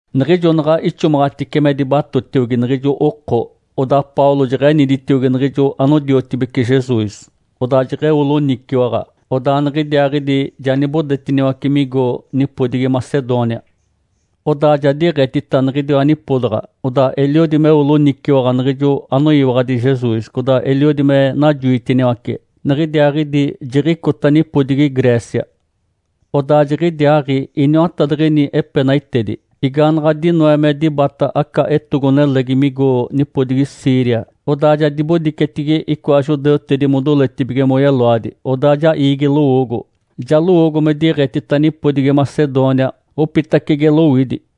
Niɡ̶ijo naɡ̶a ixomaɡ̶atice me dibatotiogi niɡ̶ijo oko, odaa Paulo jeɡ̶eniditiogi niɡ̶ijo anodiotibece Jesus, odaa jeɡ̶eo loniciwaɡ̶a. Odaa niɡ̶idiaaɡ̶idi ja nibodetiniwace migo nipodigi Macedônia. Odaa ja diɡ̶etita niɡ̶idiwa nipodaɡ̶a, odaa eliodi meo loniciwaɡ̶a niɡ̶ijo anoyiwaɡ̶adi Jesus, codaa eliodi me najoitiniwace. Niɡ̶idiaaɡ̶idi jiɡ̶icota nipodigi Grécia. Odaa jiɡ̶idiaaɡ̶i iniwatadiɡ̶ini epenaitedi. Igaanaɡ̶a dinoe me dibata aca etogo-nelegi migo nipodigi Síria, odaa ja dibodicetigi icoa judeutedi modoletibige moyeloadi. Odaa ja iigi lowoogo, ja lowoogo me diɡ̶etita nipodigi Macedônia opitacege lowidi.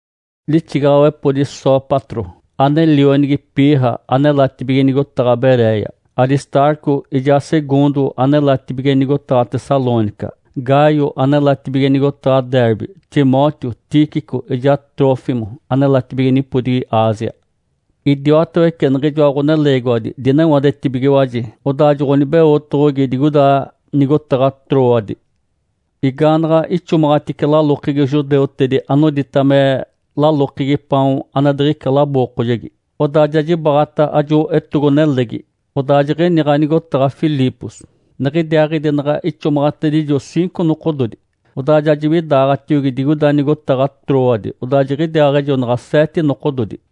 Lixigaɡ̶awepodi Sópatro, ane lionigi Pirra anelatibige nigotaɡ̶a Beréia; Aristarco ijaa Segundo anelatibige nigotaɡ̶a Tessalônica; Gaio anelatibige nigotaɡ̶a Derbe; Timóteo, Tíquico ijaa Trófimo anelatibige nipodigi Ásia. Idiwatawece niɡ̶ijoa ɡ̶oneleegiwadi dinewadetibigiwaji, odaa joɡ̶onibeotoɡ̶ogi digoida nigotaɡ̶a Trôade. Igaanaɡ̶a ixomaɡ̶atice lalokegi judeutedi anodita me “Lalokegi Paon ane diɡ̶ica labookojegi”, odaa ja jibaɡ̶ata ajo etogo-nelegi, odaa jiɡ̶iniɡ̶a nigotaɡ̶a Filipos. Niɡ̶idiaaɡ̶idi naɡ̶a ixomaɡ̶atedijo ciinco nokododi, odaa ja jiwidaaɡ̶atiogi digoida nigotaɡ̶a Trôade, odaa jiɡ̶idiaaɡ̶ejonaɡ̶a seete nokododi.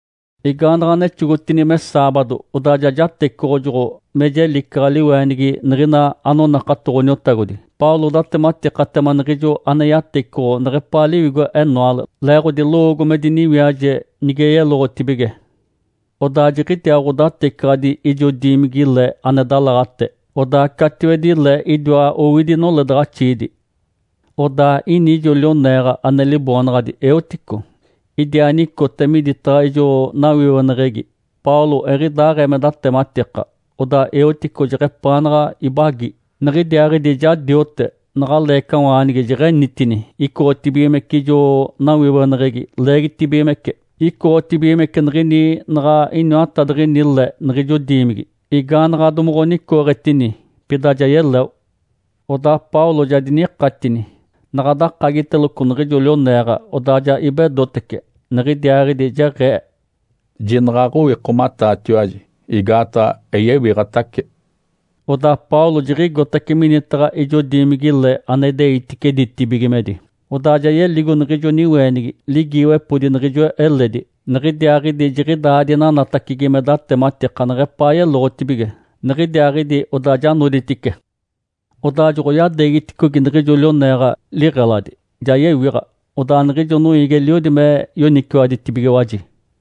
Igaanaɡ̶a nexogotini me saabado, odaa ja jatecoɡ̶ojoɡ̶o me jelicaɡ̶a liweenigi niɡ̶ina anonakato Ǥoniotagodi. Paulo datematikatema niɡ̶ijo ane yatecoɡ̶o neɡ̶epaa liwigo-enoale, leeɡ̶odi lowoogo me diniwiaje nige yeloɡ̶otibige. Odaa jiɡ̶idiaa ɡ̶odatecaɡ̶adi ijo diimigi-le ane dalaɡ̶ate, odaa catiwedi le idiwa owidi noledaɡ̶axiidi. Odaa ini ijo lioneeɡ̶a ane liboonaɡ̶adi Êutico. Idiaa nicote midataɡ̶a ijo nawiweneɡ̶egi. Paulo eɡ̶idaaɡ̶ee me datematika, odaa Êutico jeɡ̶epaanaɡ̶a ibagi, niɡ̶idiaaɡ̶idi ja diote, naɡ̶a leecawaanigi jeɡ̶enitini, icoɡ̶otibigimece ijo nawiweneɡ̶egi, leegitibigimece, icoɡ̶otibigimece niɡ̶ini naɡ̶a iniwatadiɡ̶ini le niɡ̶ijo diimigi. Igaanaɡ̶a domoɡ̶onicooɡ̶etini, pida ja yeleo. Odaa Paulo ja dinikatini, naɡ̶a dakagiteloco niɡ̶ijo lioneeɡ̶a, odaa ja ibedotece. Niɡ̶idiaaɡ̶idi jeɡ̶ee, “Jinaɡ̶a aɡ̶owikomataatiwaji, igaataɡ̶a eyewiɡ̶atace!” Odaa Paulo jiɡ̶igotace minitaɡ̶a ijo diimigi-le ane ideitice ditibigimedi, odaa ja yeligo niɡ̶ijo niweenigi, ligiiwepodi niɡ̶ijo eledi. Niɡ̶idiaaɡ̶idi jiɡ̶idaa dinanatacigi me datematika neɡ̶epaa yeloɡ̶otibige. Niɡ̶idiaaɡ̶idi odaa ja noditice. Odaa joɡ̶oyadeegiticogi niɡ̶ijo lioneeɡ̶a liɡ̶eladi, ja yewiɡ̶a, odaa niɡ̶ijo noiigi eliodi me yoniciwaditibigiwaji.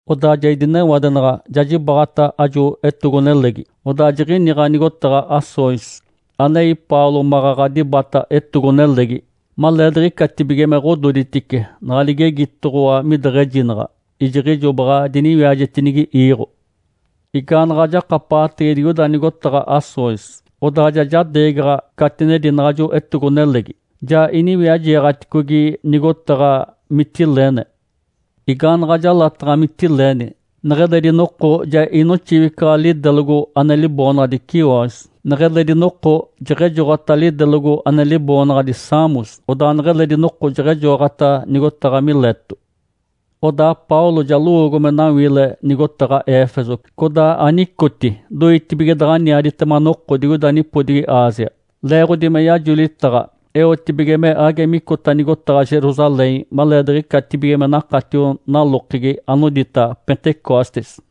Odaa ja idinewadenaɡ̶a ja jibaɡ̶ata ajo etogo-nelegi, odaa jiɡ̶iniɡ̶a nigotaɡ̶a Assôs anei Paulo maɡ̶aɡ̶a dibata etogo-nelegi. Maleediɡ̶icatibige me ɡ̶ododitice naɡ̶a ligegitoɡ̶owa mideɡ̶ejinaɡ̶a, ijiɡ̶ijo baɡ̶a diniwiajetinigi iiɡ̶o. Igaanaɡ̶a jakapaɡ̶atege digoida nigotaɡ̶a Assôs. Odaa ja jadeegaɡ̶a catinedi naɡ̶ajo etogo-nelegi, ja iniwiajeeɡ̶aticogi nigotaɡ̶a Mitilene. Igaanaɡ̶a jalataɡ̶a Mitilene, neɡ̶eledi noko ja inoxiwicaɡ̶a lidelogo ane liboonaɡ̶adi Quios. Neɡ̶eledi noko jeɡ̶ejoɡ̶ota lidelogo ane liboonaɡ̶adi Samos, odaa neɡ̶eledi noko jeɡ̶ejoɡ̶ota nigotaɡ̶a Mileto. Odaa Paulo ja lowoogo me nawiile nigotaɡ̶a Éfeso codaa anicoti doitibige daɡ̶aniaditema noko digoida nipodigi Ásia, leeɡ̶odi me yajolitaɡ̶a eotibige me age micota nigotaɡ̶a Jerusalém maleediɡ̶icatibige me nakatio nalokegi anodita “Pentecostes”.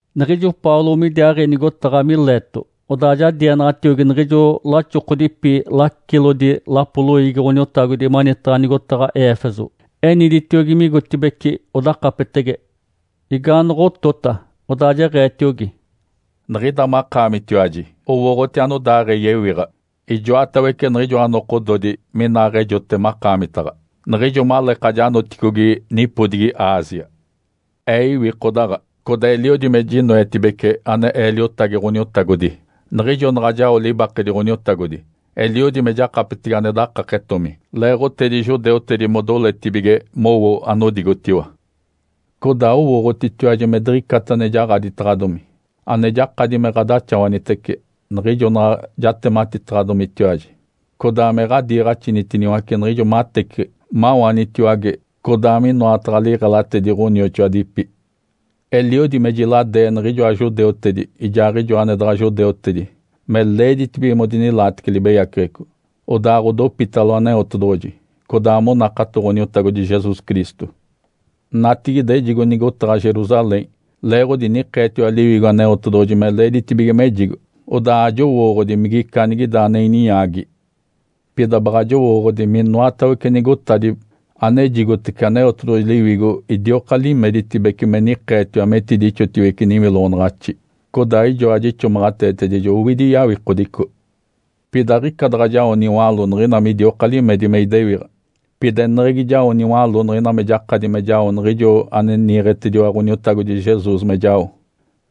Niɡ̶ijo Paulo midiaaɡ̶i nigotaɡ̶a Mileto, odaa ja dienaɡ̶atiogi niɡ̶ijo laxokodipi lacilodi lapo loiigi Ǥoniotagodi manitaɡ̶a nigotaɡ̶a Éfeso. Eniditiogi migotibeci odakapetege. Igaanoɡ̶otota, odaa jeɡ̶eetiogi, “Niɡ̶ida makaamitiwaji owooɡ̶oti anodaaɡ̶ee yewiɡ̶a ijoatawece niɡ̶ijoa nokododi minaaɡ̶ejote makaamitaɡ̶a, niɡ̶ijo maleeka janoticogi nipodigi Ásia. Ee iwikodaɡ̶a, codaa eliodi me jinoetibece ane ee liotagi Ǥoniotagodi, niɡ̶ijo naɡ̶a jao libakedi Ǥoniotagodi, eliodi me jakapetege ane dakaketomi leeɡ̶otedi judeutedi modoletibige mowo anodigotiwa. Codaa owooɡ̶otitiwaji me diɡ̶icata ane jaɡ̶aditaɡ̶adomi, ane jakadi me ɡ̶adaxawanitece, niɡ̶ijo naɡ̶a jatematikataɡ̶adomitiwaji codaa me ɡ̶adiiɡ̶axinitiniwace niɡ̶ijo mateciɡ̶i, mawanitiwage, codaa minoataɡ̶a liɡ̶elatedi ɡ̶onioxoadipi. Eliodi me jiladee niɡ̶ijoa judeutedi ijaaɡ̶ijo ane daɡ̶a judeutedi me leeditibige modinilaatece libeyaceɡ̶eco, odaaɡ̶odopitalo Aneotedoɡ̶oji, codaa monakato Ǥoniotagodi Jesus Cristo. Natigide ejigo nigotaɡ̶a Jerusalém leeɡ̶odi nikeetiwa Liwigo Aneotedoɡ̶oji me leeditibige mejigo. Odaa ajowooɡ̶odi migica anigida ane ininyaagi. Pida baɡ̶a jowooɡ̶odi minoatawece nigotadi anejigotece Aneotedoɡ̶oji Liwigo idioka limeditibece me nikeetiwa metidixotiwece niwiloɡ̶onaɡ̶axi, codaa ijoa jixomaɡ̶ateetedijo owidi yawikodico. Pida aɡ̶ica daɡ̶a jao niwaló niɡ̶ina midioka limedi me idewiɡ̶a, pida eneɡ̶egi jao niwaló niɡ̶ina me jakadi me jao niɡ̶ijo ane niiɡ̶etediwa Ǥoniotagodi Jesus me jao,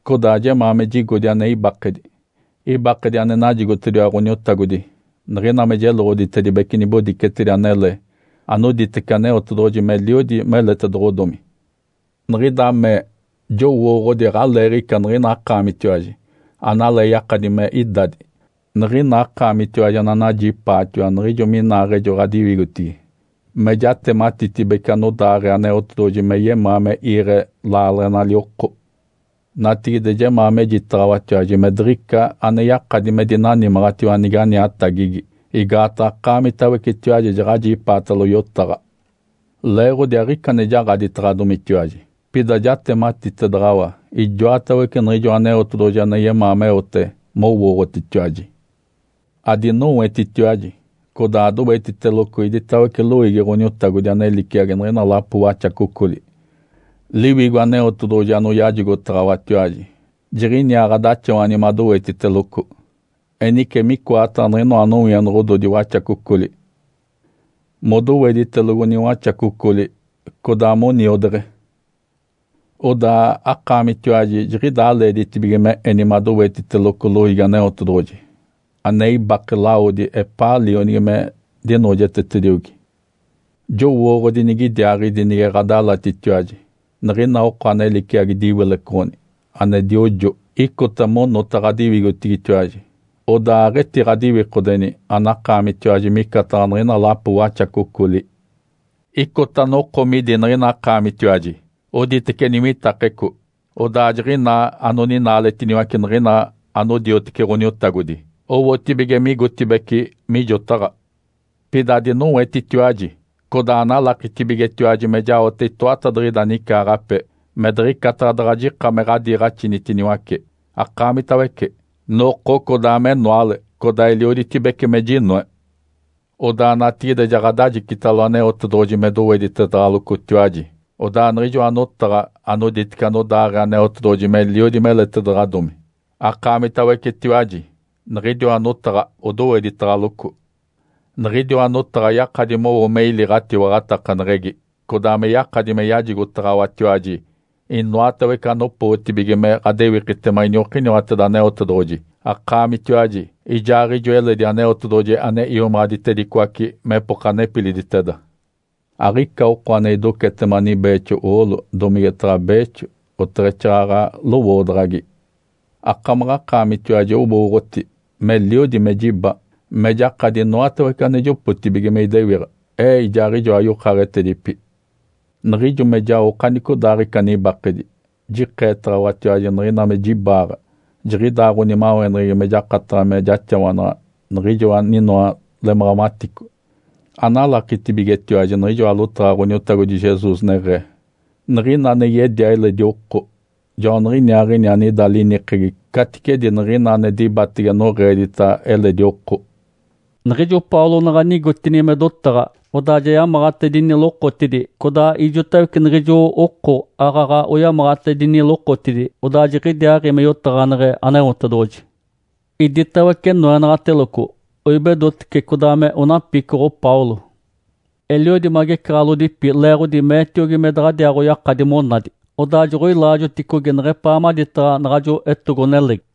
codaa jemaa me jigodi ane ibakedi. Ibakedi ane najigotediwa Ǥoniotagodi niɡ̶ina me jeloɡ̶oditedibece nibodicetedi anele anoditece Aneotedoɡ̶oji meliodi meletedoɡ̶odomi. Niɡ̶ida mee jowooɡ̶odi aɡ̶aleeɡ̶ica niɡ̶ina akaamitiwaji analee yakadi me idadi, niɡ̶ina akaamitiwaji ananajipaatiwa niɡ̶ijo minaaɡ̶ejo ɡ̶adiwigotigi me jatematitibece anodaaɡ̶ee Aneotedoɡ̶oji me yemaa me iiɡ̶e laaleɡ̶enali oko. Natigide jemaa mejitaɡ̶awatiwaji me diɡ̶ica ane yakadi me dinanimaɡ̶atiwa nige aniatagigi, igaataɡ̶a akaamitawecetiwaji jaɡ̶ajipaatalo yotaɡ̶a. Leeɡ̶odi aɡ̶ica ane jaɡ̶aditaɡ̶adomitiwaji, pida jatematitedaɡ̶awa ijoatawece niɡ̶ijoa Aneotedoɡ̶oji ane yemaa meote mowooɡ̶otitiwaji. Adinowetitiwaji, codaa adowetiteloco iditawece loiigi Ǥoniotagodi ane liciagi niɡ̶ina lapo waxacocoli, Liwigo Aneotedoɡ̶oji anoyajigotaɡ̶awatiwaji jiɡ̶iniaa ɡ̶adaxawani madowetiteloco. Enice micoataɡ̶a niɡ̶inoa nowienoɡ̶ododi waxacocoli modoweditelogo niwaxacocoli codaa moniodeɡ̶e, odaa akaamitiwaji jiɡ̶idaa leeditibige me eni madowetiteloco loiigi Aneotedoɡ̶oji ane ibake lawodi epaa Lionigi me dinoojetetediogi. Jowooɡ̶odi nigidiaaɡ̶idi nige ɡ̶adalatitiwaji, niɡ̶ina oko ane liciagi diwilecoɡ̶oni ane diojo icota monota ɡ̶adiwigotigitiwaji. Odaa aɡ̶etiɡ̶adiwikodeni anakaamitiwaji micataɡ̶a niɡ̶ina lapo waxacocoli. Icota noko midi niɡ̶ina akaamitiwaji oditece niwitakeco, odaa jiɡ̶inaa anoninaaletiniwace niɡ̶ina anodiotece Ǥoniotagodi owotibige migotibeci mijotaɡ̶a. Pida adinowetitiwaji, codaa analakitibigetiwaji me jaote itoatadiɡ̶ida nicaaɡ̶ape me diɡ̶icata daɡ̶a jika me ɡ̶adiiɡ̶axinitiniwace akaamitawece, noko codaa menoale, codaa elioditibece me jinoe. Odaa natigide ja ɡ̶adajicitalo Aneotedoɡ̶oji me doweditedaɡ̶alocotiwaji. Odaa niɡ̶ijoa notaɡ̶a anoditece anodaaɡ̶ee Aneotedoɡ̶oji meliodi meletedaɡ̶adomi akaamitawecetiwaji, niɡ̶idiwa notaɡ̶a odoweditaɡ̶aloco. Niɡ̶idiwa notaɡ̶a yakadi mowo me ili ɡ̶atiwaɡ̶atakaneɡ̶egi, codaa me yakadi me yajigotaɡ̶awatiwaji inoatawece anopootibige me ɡ̶adewikitema iniokiniwateda Aneotedoɡ̶oji akaamitiwaji ijaaɡ̶ijo eledi Aneotedoɡ̶oji ane iomaɡ̶aditedicoace mepoka nepiliditeda. Aɡ̶ica oko ane idocetema nibeexo oolo, domigetaɡ̶a beexo, oteɡ̶exaaɡ̶aɡ̶a lowoodaɡ̶agi. Akamaɡ̶akaamitiwaji owooɡ̶oti meliodi me jiba me jakadi inoatawece ane jopotibige me idewiɡ̶a, ee ijaaɡ̶ijoa yokaaɡ̶etedipi. Niɡ̶ijo me jao okanicodaaɡ̶ica nibakedi, jikeetaɡ̶awatiwaji niɡ̶ina me jibaaɡ̶a jiɡ̶idaa ɡ̶onimaweneɡ̶egi me jakataɡ̶a me jaxawanaɡ̶a niɡ̶ijo aninoa lemaɡ̶amatico. Analakitibigetiwaji niɡ̶ijoa lotaɡ̶a Ǥoniotagodi Jesus neɡ̶ee, ‘Niɡ̶ina ane yedia eledi oko, joaniɡ̶iniaaɡ̶ini anida linikegi caticedi niɡ̶ina ane dibatege noɡ̶eedita eledi oko.’” Niɡ̶ijo Paulo naɡ̶a nigotini me dotaɡ̶a, odaa ja yamaɡ̶atedini lokotidi, codaa ijotawece niɡ̶ijo oko aaɡ̶aɡ̶a oyamaɡ̶atedini lokotidi, odaa jiɡ̶idiaaɡ̶i me yotaɡ̶aneɡ̶e Aneotedoɡ̶oji. Iditawece noenaɡ̶ateloco, oibedotece codaa me onapicoɡ̶o Paulo. Eliodi magecaɡ̶alodipi leeɡ̶odi meetiogi me daɡ̶adiaaɡ̶oyakadi monadi. Odaa joɡ̶oilaajoticogi neɡ̶epaa maditaɡ̶a naɡ̶ajo etogo-nelegi.